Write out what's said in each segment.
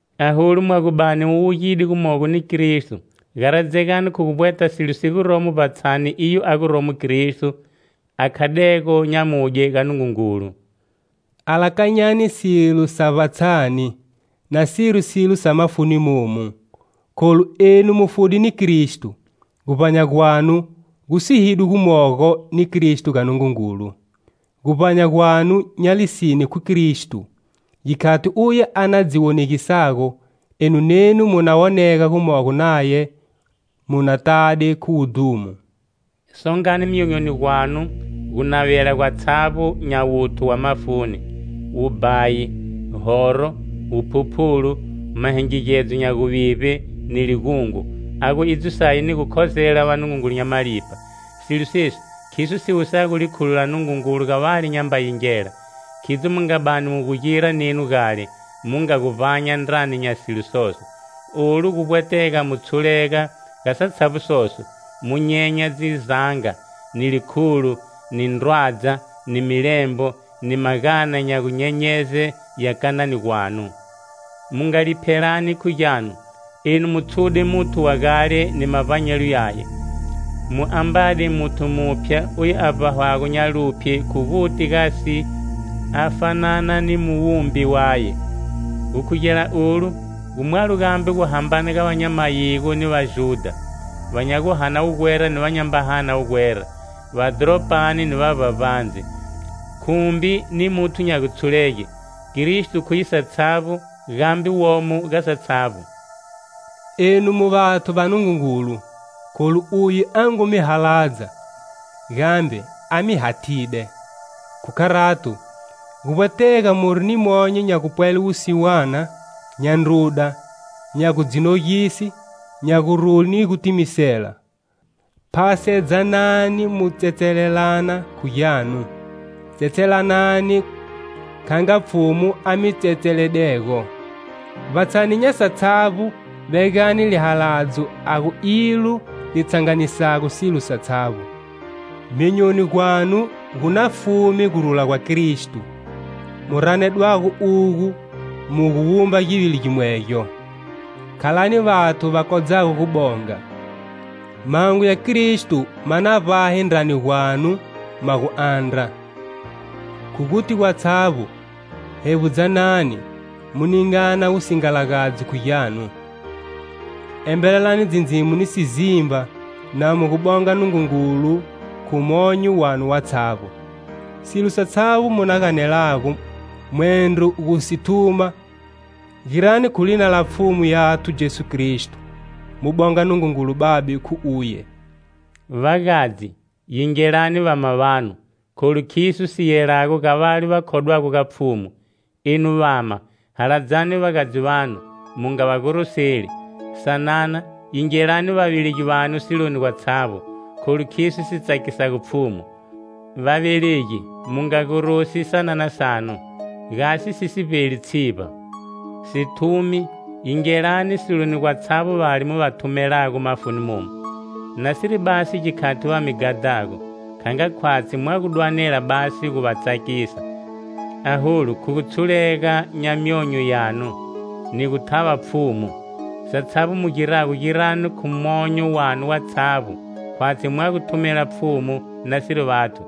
Aholu mwa gu bani mu wugide gumogo ni Kristo garadzegani khu guvbweta silo si guromo vbatshani, iyo a guromo Kristo a khadego nyamudye ga Nungungulu. Alakanyani silo sa vbatshani, nasiri silo sa mafuni momu, kholu enu mu fude ni Kristo, guvbanya gwanu gu sihidwe gumogo ni Kristo ga Nungungulu. Guvbanya gwanu nya lisine khu Kristo, gikhati uye a na dzi wonegisago, enu nenu mu na wonega gumogo naye mu na tade khu wudhumo. Songani myonyoni gwanu gunavela gwatshavbo nya wuthu wa mafuni: wubhayi, horo, wuphuphulu, mahingigedzo nya guvivbe ni ligungo a gu idzo saye ni gu khozela vanungungulu nya malipha. Silo sesi khiso si wusago likhulo la Nungungulu ga vale nyamba yingela. Khidzo mu nga bani mu gu gira nenu gale, mu nga gu vbanya ndrani nya silo soso. Olu gu vbwetega mu tshulega ga satshavbo soso, mu nyenya dzizanga, ni likhulo, ni ndrwadza, ni milembo, ni magana nya gunyenyeze ya kanani gwanu. Mu nga liphelani khu gyanu. Enu mu tshude muthu wa gale ni mavbanyelo yaye, mu ambade muthu muphya oyu a vbahwago nya luphye khu guti gasi a fanana ni muwumbi waye. Gukhugela olu, gu mwalo gambe guhambana nya va nya mayigo ni Vajudha, va nya guhana wugwera ni ava nyamba hana wugwera, va dhoropani ni va vbavbandze, khumbi ni muthu nya gutshulege. Kristo khuye satshavbo, gambe womo ga satshavbo. Enu mu vathu va Nungungulu, kholu uye a ngu mi haladza, gambe a mi hathide. Khu kharato, guvbwetega muri ni monyo nya gupwele wusiwana, nya ndruda, nya gu dzi nogise, nya gurule ni gutimisela. Phasedzanani mu tsetselelana khu gyanu, tsetselelanani kha nga Pfhumu a mi tsetseledego. Vbatshani nya satshavbo vegani lihaladzo a gu ilo li tshanganisago silo satshavbo. Myonyoni gwanu gu na fume gurula gwa Kristo, mu ranedwago ugo mu gu wumba givili gimwegyo. Khalani vathu va kodzago gubonga. Mahungu ya Kristo ma na vbahe ndrani gwanu ma gu andra. Khu guti gwatshavbo, hevbudzanani, mu ningana wusingalagadzi khu gyanu. Embelelani dzindzimo ni sizimba na mu gu bonga Nungungulu khu monyo wanu watshavbo. Silo satshavbo mu na ganelago mwendro gu si thuma girani khu lina la Pfhumu yathu Jesu Kristo, mu bonga Nungungulu Babe khu uye. Vagadzi, yingelani vama vanu, kholu khiso si yelago ga vale va khodwago ga Pfhumu. Enu vama, haladzani vagadzi vanu, mu nga va goroseli. Sanana, yingelani vavelegi vanu siloni gwatshavbo, kholu khiso si tsakisago Pfhumu. Vavelegi mu nga gorosi sanana sanu, gasi si si vbeli tshivba. Sithumi, yingelani siloni gwatshavbo vale mu va thumelago mafuni momu, nasiri basi gikhati va mi ghadhago, nga khwatshi mwa gu dwanela basi gu va tsakisa, aholu khu gutshulega nya myonyo yanu ni gu thava Pfhumu. Satshavbo mu girago girani khu monyo wanu watshavbo khwatshi mwa gu thumela Pfhumu nasiri vathu.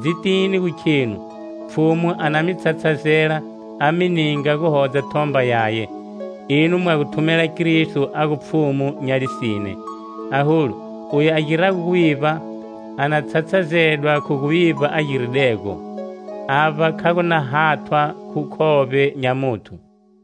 Dzitini gu khenu Pfhumu a na mi tshatshazela a mi ninga guhodza thomba yaye. Enu mwa gu thumela Kristo a gu Pfhumu nya lisine. Aholu, oyu a girago guvivba a na tshatshazedwa khu guvivba a giridego. Avba kha gu na hathwa khu khovbe nya muthu.